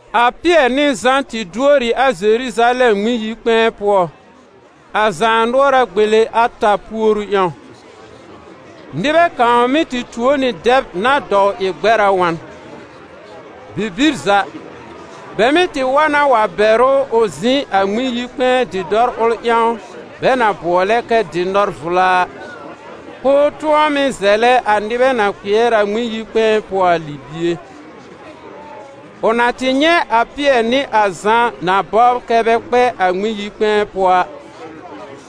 A Pɩɛr nɩ Zã tɩ duor ɩ a Zeruzalɛm Ŋmɩn-yi-kpɛ̃ɛ pʋɔ, a zaanʋɔra gbele ata puoru ƴãw. Nɩbɛ kãw mɩ́ tɩ tuo nɩ dɛb na dɔw ɩ gbɛr a wa n. Bibir za, bɛ mɩ́ tɩ wa na wa bɛr ʋ ʋ zɩ̃ a Ŋmɩn-yi-kpɛ̃ɛ dɩ̃dɔr ʋl ƴãw bɛ na bʋɔlɛ kɛ «Dɩ̃dɔr-vla» a, k'ʋʋ tʋ̃ɔ mɩ́ zɛlɛ a nɩbɛ na kpɩɛr a Ŋmɩn-yi-kpɛ̃ɛ pʋɔ a libie. Ʋ na tɩ nyɛ̃ a Pɩɛr nɩ a Zã na bɔbr kɛ́ bɛ kpɛ a Ŋmɩn-yi-kpɛ̃ɛ pʋɔ a,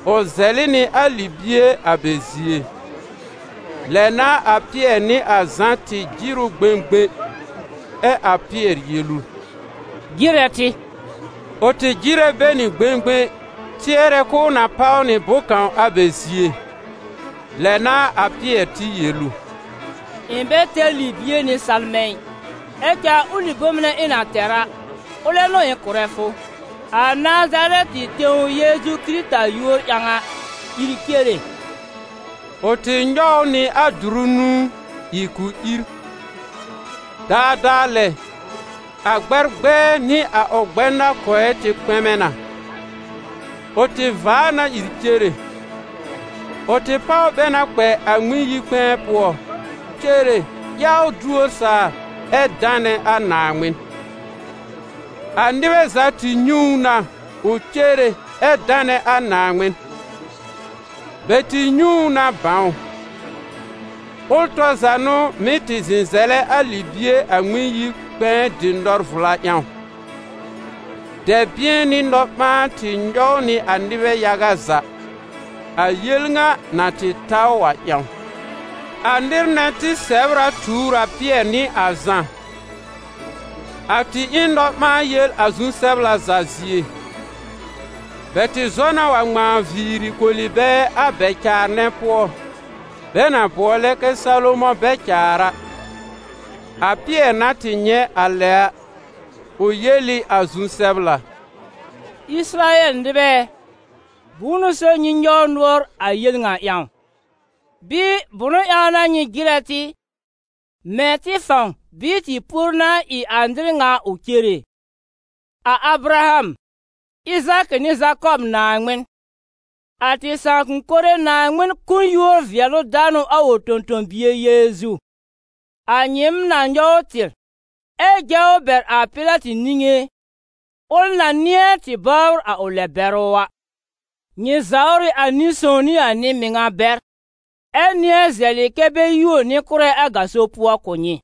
ʋ zɛlɩ nɩ a libie a bɛ zie. Lɛ n'a a Pɩɛr nɩ a Zã tɩ jɩr ʋ gbẽgbẽ, ɛ a Pɩɛr yel ʋ: «Jɩrɛ tɩ!» Ʋ tɩ jɩrɛ bɛ nɩ gbẽgbẽ tɩɛrɛ k'ʋʋ na páw nɩ bʋ̃-kãw a bɛ zie. Lɛ n'a a Pɩɛr tɩ yel ʋ: «Ɩ̃ bɛ tɛr libie nɩ salmɛ̃ ɩ, ɛ cɛ a ʋlɩ bom nɛ ɩ̃ na tɛr a, ʋlɛ n'ʋ ɩ̃ kʋ̀rɛ fʋ: a Nazarɛtɩ tẽw Yeezu Kɩrɩta yúor ƴãw a, ìr cere!» Ʋ tɩ nyɔw ʋ nɩ a dʋrʋ nũú, ɩ k'ʋ ìr. Daadaa lɛ, a gbɛr gbɛɛ nɩ a ʋ gbɛnakɔɛ tɩ kpɛmɛ na. Ʋ tɩ vaa na ìr cere. Ʋ tɩ páw bɛ na kpɛ a Ŋmɩn-yi-kpɛ̃ɛ pʋɔ, cere, yawr duor saa, ɛ danɛ a Naaŋmɩn. A nɩbɛ za tɩ nyɛ̃ ʋ na ʋ cere ɛ danɛ a Naaŋmɩn. Bɛ tɩ nyɛ̃ ʋ na bãw: ʋl tɔr za n'ʋ mɩ́ tɩ zɩ̃ zɛlɛ a libie a Ŋmɩn-yi-kpɛ̃ɛ Dɩ̃dɔr-vla ƴãw. Dɛ̃bɩ̃ɛ nɩ nɔ-ɓãan tɩ nyɔw nɩ a nɩbɛ yaga za, a yel ŋa na tɩ ta ʋ a ƴãw. A nɩr nɛ tɩ sɛ̀br a tuur a Pɩɛr nɩ a Zã; a tɩ ɩ n nɔ-ɓãa-yel a zu-sɛbla za zie. Bɛ tɩ zɔ na wa ŋmãa viiri koli bɛ a bɛ-caar nɛ pʋɔ, bɛ na bʋɔlɛ kɛ «Salomɔ̃ bɛ-caar» a. A Pɩɛr na tɩ nyɛ̃ a lɛ a, ʋ yel ɩ a zu-sɛbla: «Ɩsɩrayɛl nɩbɛ ɛ, bʋ̃ʋ n'ʋ so nyɩ nyɔw nʋɔr a yel ŋa ƴãw? Bɩɩ, bʋ̃ʋ ƴãw n'a nyɩ jɩrɛ tɩ, mɛ̃ tɩ fãw bɩɩ tɩ puoru n'a ɩ a nɩr ŋa ʋ cere? A Abraham, Ɩzaakɩ nɩ Zakɔb Naaŋmɩn, a tɩ sãakʋm mɩnɛ Naaŋmɩn kʋ̀ n yúor-vɩɛlʋ-danʋ a ʋ tõ-tõ-bie Yeezu, a nyɩɩm na nyɔw tɩr, ɛ jɛ ʋ bɛr a Pɩlatɩ niŋé, ʋl na nɩ̃ɛ tɩ bɔbr a ʋ lɛ-bɛrʋ a. Nyɩ zawr ɩ a Nɩ-sõw nɩ a Nɩ-mɩŋa bɛr, ɛ nɩ̃ɛ zɛlɩ kɛ́ bɛ yuo nɩ-kʋ́rɛ a gaso pʋɔ kʋ̀ nyɩ.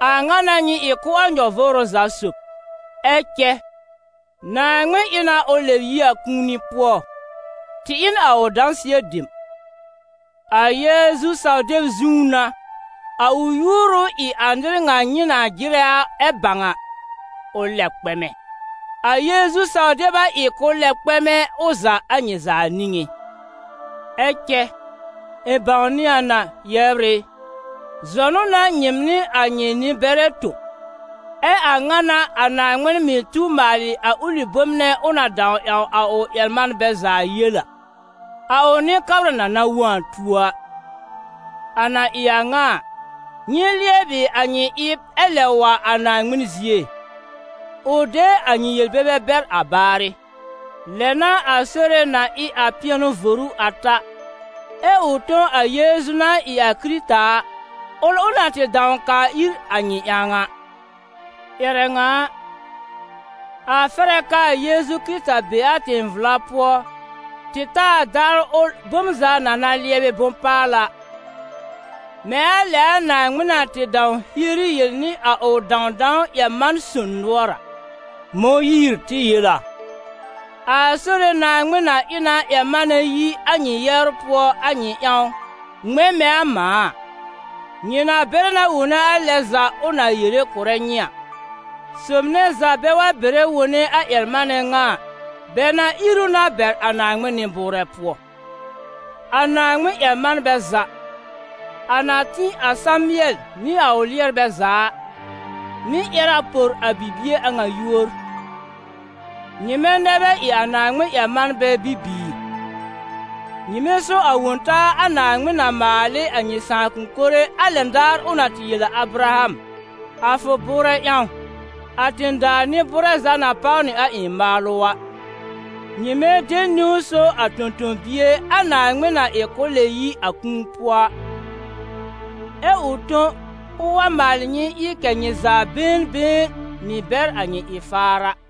A ŋa n'a nyɩ ɩ kʋ́ a nyɔ-vʋʋrʋ za sob. Ɛ cɛ Naaŋmɩn ɩ na ʋ lɛb yi a kũuni pʋɔ, tɩ ɩ n a ʋ dãsɩɛ dem. A Yeezu saw-deb zũú n'a, a ʋ yúor ʋ ɩ a nɩr ŋa nyɩ na jɩrɛ ɛ bãw a, ʋ lɛb kpɛmɛ; a Yeezu saw-deb a ɩ k'ʋ lɛb kpɛ̃w ʋ za a nyɩ za niŋé.» «Ɛ cɛ, ɩ̃ bãwnɩ a na, yɛbr ɩ, zɔnʋ n'a nyɩɩm nɩ a nyɩ nɩ-bɛrɛ tõ. Ɛ a ŋa n'a a Naaŋmɩn mɩ̀ tu maalɩ a ʋlɩ bom nɛ ʋ na dãw ƴãw a ʋ ƴɛr-manbɛ za yel a: a ʋ Nɩ-kabra na na wõ a tuo a. A na ɩ a ŋa a, nyɩ lɩɛbɩ a nyɩ ɩb ɛ lɛb wa a Naaŋmɩn zie, ʋ de a nyɩ yel-bebe bɛr a baarɩ. Lɛ n'a a Sore na ɩ a pɩɛnʋ voru a ta, ɛ ʋ tõ a Yeezu na ɩ a Kɩrɩta a, ʋl ʋ na tɩ dãw kaa ir a nyɩ ƴãw a. Ƴɛrɛ ŋa a, a fɛr a k'aa Yeezu Kɩrɩta be a tẽ-vla pʋɔ tɩ ta a daar ʋl bom za na na lɩɛbɩ bʋ̃-paala, mɛ̃ a lɛ a Naaŋmɩn na tɩ dãw hieri yel nɩ a ʋ dãwdãw ƴɛr-man-son nʋɔr a. Mõyiir tɩ yel a: ‹A Sore Naaŋmɩn na ɩ na ƴɛr-manɛ yi a nyɩ yɛbr pʋɔ a nyɩ ƴãw, ŋmɛ̃ mɛ̃ a mãa a. Nyɩ na bɛrɛ na wone a lɛ za ʋ na yere kʋ̀rɛ nyɩ a. Sob nɛ za bɛ wa bɛrɛ wone a ƴɛr-manɛ ŋa a, bɛ na ír ʋ na bɛr a Naaŋmɩn nɩ-bʋʋrɛ pʋɔ.› A Naaŋmɩn-ƴɛr-manbɛ za, a na tĩ a Samɩɛl nɩ a ʋ lɩɛrbɛ za a, mɩ̀ ƴɛr a por a bibie a ŋa yúor. Nyɩmɛ nɛ bɛ ɩ a Naaŋmɩn-ƴɛr-manbɛ bibiir: nyɩmɛ so a Wõ-taa a Naaŋmɩn na maal ɩ a nyɩ sãakʋm mɩnɛ a lɛn daar ʋ na tɩ yel a Abraham: ‹A fʋ bʋʋrɛ ƴãw, a tẽ-daa nɩ-bʋʋrɛ za na páw nɩ a ɩ̃ maalʋ› a. Nyɩmɛ de niwn so a Tõ-tõ-bie a Naaŋmɩn na ɩ ʋ lɛb yi a kũuni pʋɔ, ɛ ʋ tõ k'ʋʋ wa maalɩ nyɩ ɩ kɛ̀ nyɩ za been been mɩ́ bɛr a nyɩ ɩ-faar a.»